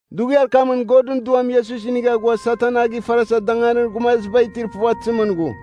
Dughiar kamɨn Godɨn Duam Iesus inigha ghua Satan a gifarasa danganir gumaziba itir puvatɨzimɨn ghu.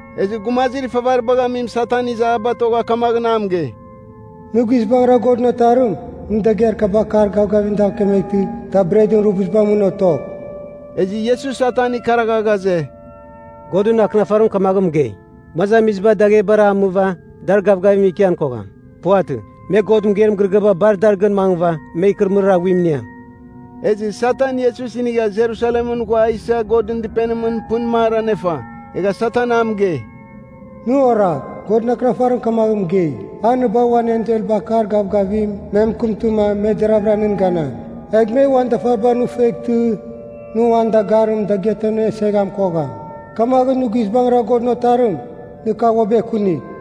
Ezɨ gumazir ifavaribagh amim Satan iza a batogha kamaghɨn a mɨgei, “Nɨ guizbangɨra Godɨn Otarim, nɨ dagɨar kaba akar gavgavim dav kemeghtɨ da bretɨn rubuzibar mɨn otogh.” Ezɨ Iesus Satan ikaragha ghaze, “Godɨn Akɨnafarim kamaghɨn mɨgei, ‘Gumazamiziba daghebara damɨva dar gavgavimɨn ikian kogham. Puvatɨ. Me God mɨgeir mɨgɨrɨgɨaba bar dar gɨn mangɨva me ikɨrɨmɨrir aghuim iniam.’” Ezɨ Satan Iesus inigha Jerusalemɨn ghua a isa Godɨn Dɨpenimɨn pɨn mar anefa. Egha Satan a mɨgei, “Nɨ oragh, Godɨn Akɨnafarim kamagh mɨgei, ‘A nɨ bagh uan enselba akar gavgavim me mɨkɨmtɨma me deraghvɨra nɨn ganam. Egh me uan dafaribar nɨ fueghtɨ, nɨ uan dagarim dagɨatamɨn aneseghan kogham.’ Kamaghɨn nɨ guizbangɨra Godɨn Otarim, nɨ kagh uabɨ ekunigh.”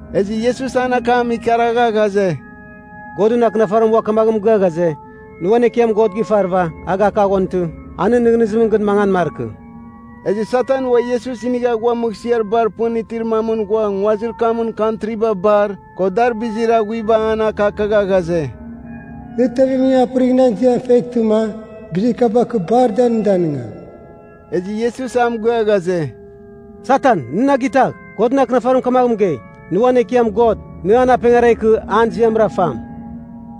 Ezɨ Iesus an akam ikaragha ghaze, “Godɨn Akɨnafarim ua kamaghɨn mɨgɨa ghaze, ‘Nɨ uan Ekiam God a gifarɨva, a gakaghontɨ, a nɨn nɨghnɨzimɨn gɨn mangan markɨ.’” Ezɨ Satan ua Iesus inigha ghua mɨghsɨar bar pɨn itir mamɨn ghua nguazir kamɨn kantriba bar, ko dar bizir aghuiba an akakagha ghaze, “Nɨ tevemning apɨrigh nan ziam feghtɨma, bizir kaba kɨ bar da nɨ danɨngam.” Ezɨ Iesus a mɨgɨa ghaze, “Satan nɨ na gitagh! Godɨn Akɨnafarim kamagh mɨgei, ‘Nɨ uan Ekiam God, nɨ an apengara ikɨ an ziamra fam.’”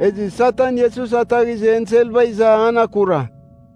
Ezɨ Satan Iesus ataghizɨ enselba iza an akura.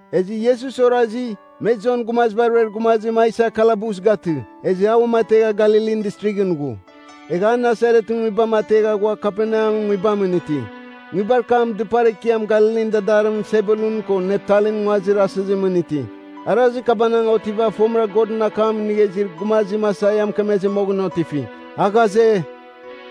Ezɨ Iesus orazi, me Jon Gumaziba Ruer Gumazim a isa kalabus gatɨ, ezɨ a uamategha Galilin Distrighɨn ghu. Egha a Nasaretɨn nguibam ategha ghua Kaperneamɨn nguibamɨn iti. Nguibar kam dɨpar ekiam Galilin dadarimɨn Sebulun ko Naptalin nguazir asɨzimɨn iti. Arazir kabanagh otiva fomɨra Godɨn akam inigha izir gumazim Aisaia mɨkemezɨ moghɨn otifi. A ghaze,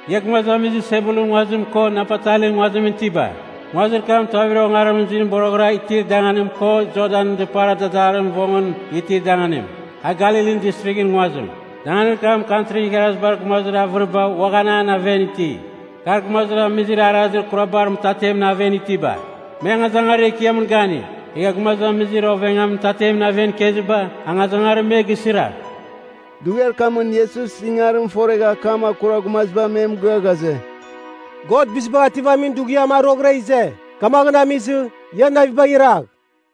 “Ia gumazamizir Sebulunɨn nguazim ko Naptalin nguazimɨn itiba, nguazir kam a tuavir ongarimɨn zuim boroghɨra itir danganim ko Jordanɨn dɨpar dadarir vongɨn itir danganim, a Galilin Distrighɨn nguazim. Danganir kam Kantrin Igharazibar Gumazir avɨriba uaghan an aven iti. Kar, gumazamizir arazir kurabar mɨtatemɨn aven itiba, me angazangarir ekiamɨn gani. Egha gumazamizir ovengamin mɨtatemɨn aven ikeziba, angazangarim me gisira.” Dughiar kamɨn Iesus ingarim foregha akam akura gumaziba me mɨgɨa ghaze, “God Bizibagh Ativamin Dughiam a roghɨra ize. Kamaghɨn amizɨ, ia navibagh iragh!”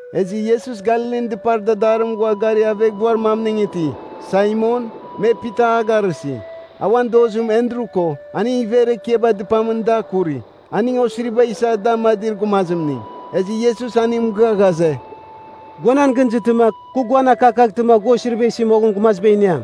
Ezɨ Iesus Galilin dɨpar dadarimɨn ghua gari aveghbuar mamning iti. Saimon, me “Pita” a garɨsi. A uan dozim Endru ko, aning iver ekiaba dɨpamɨn da kuri. Aning osiriba isa da amadir gumazimning. Ezɨ Iesus aning mɨgɨa ghaze, “Gua nan gɨn izɨtɨma kɨ guan akakaghtɨma, gua osiriba isi moghɨn gumaziba iniam.”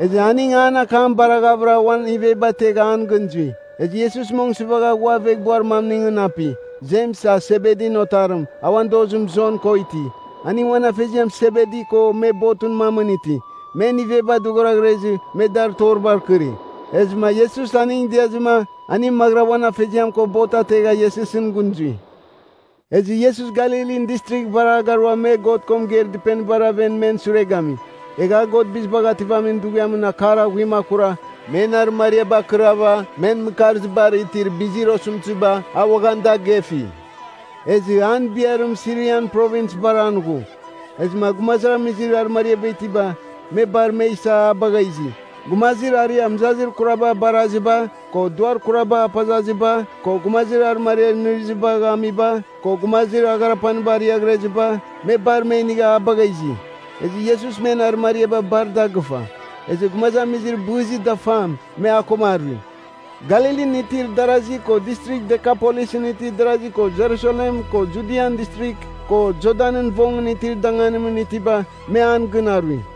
Ezɨ aning an akam baraghavɨra, uan iveba ategha an gɨn zui. Ezɨ Iesus mong sɨvagha ghua aveghbuar mamningɨn api. Jems, a Sebedin otarim, a uan dozim Jon ko iti. Aning uan afeziam Sebedi ko me botɨn mamɨn iti. Men iveba dɨghoraghrezɨ, me dar toribar kɨri. Ezɨma Iesus aning diazɨma, aning maghɨra uan afeziam ko bot ategha Iesusɨn gɨn zui. Ezɨ Iesus Galilin Distrigh bar a garua me God ko mɨgeir dɨpenibar aven men sure gami. Egha a God Bizibagh Ativamin Dughiamɨn akar aghuim akura, men arɨmariaba akɨrava men mɨkarzibar itir bizir osɨmtɨziba a uaghan da gefi. Ezɨ an biarim Sirian Provins bar an ghu. Ezɨma gumazamizir arɨmariaba itiba, me bar me isa a bagha izi. Gumazir aria mɨzazir kuraba baraziba, ko duar kuraba apazaziba, ko gumazir arɨmariar inɨrɨzibagh amiba, ko gumazir agharapaniba ariaghreziba, me bar me inigha a bagha izi. Ezɨ Iesus men arɨmariaba bar da gɨfa. Ezɨ gumazamizir bɨzir dafam, me a koma arui. Galilin itir darasi ko Distrigh Dekapolisɨn itir darazi ko Jerusalem ko Judian Distrigh, ko Jordanɨn vongɨn itir danganimɨn itiba me an gɨn arui.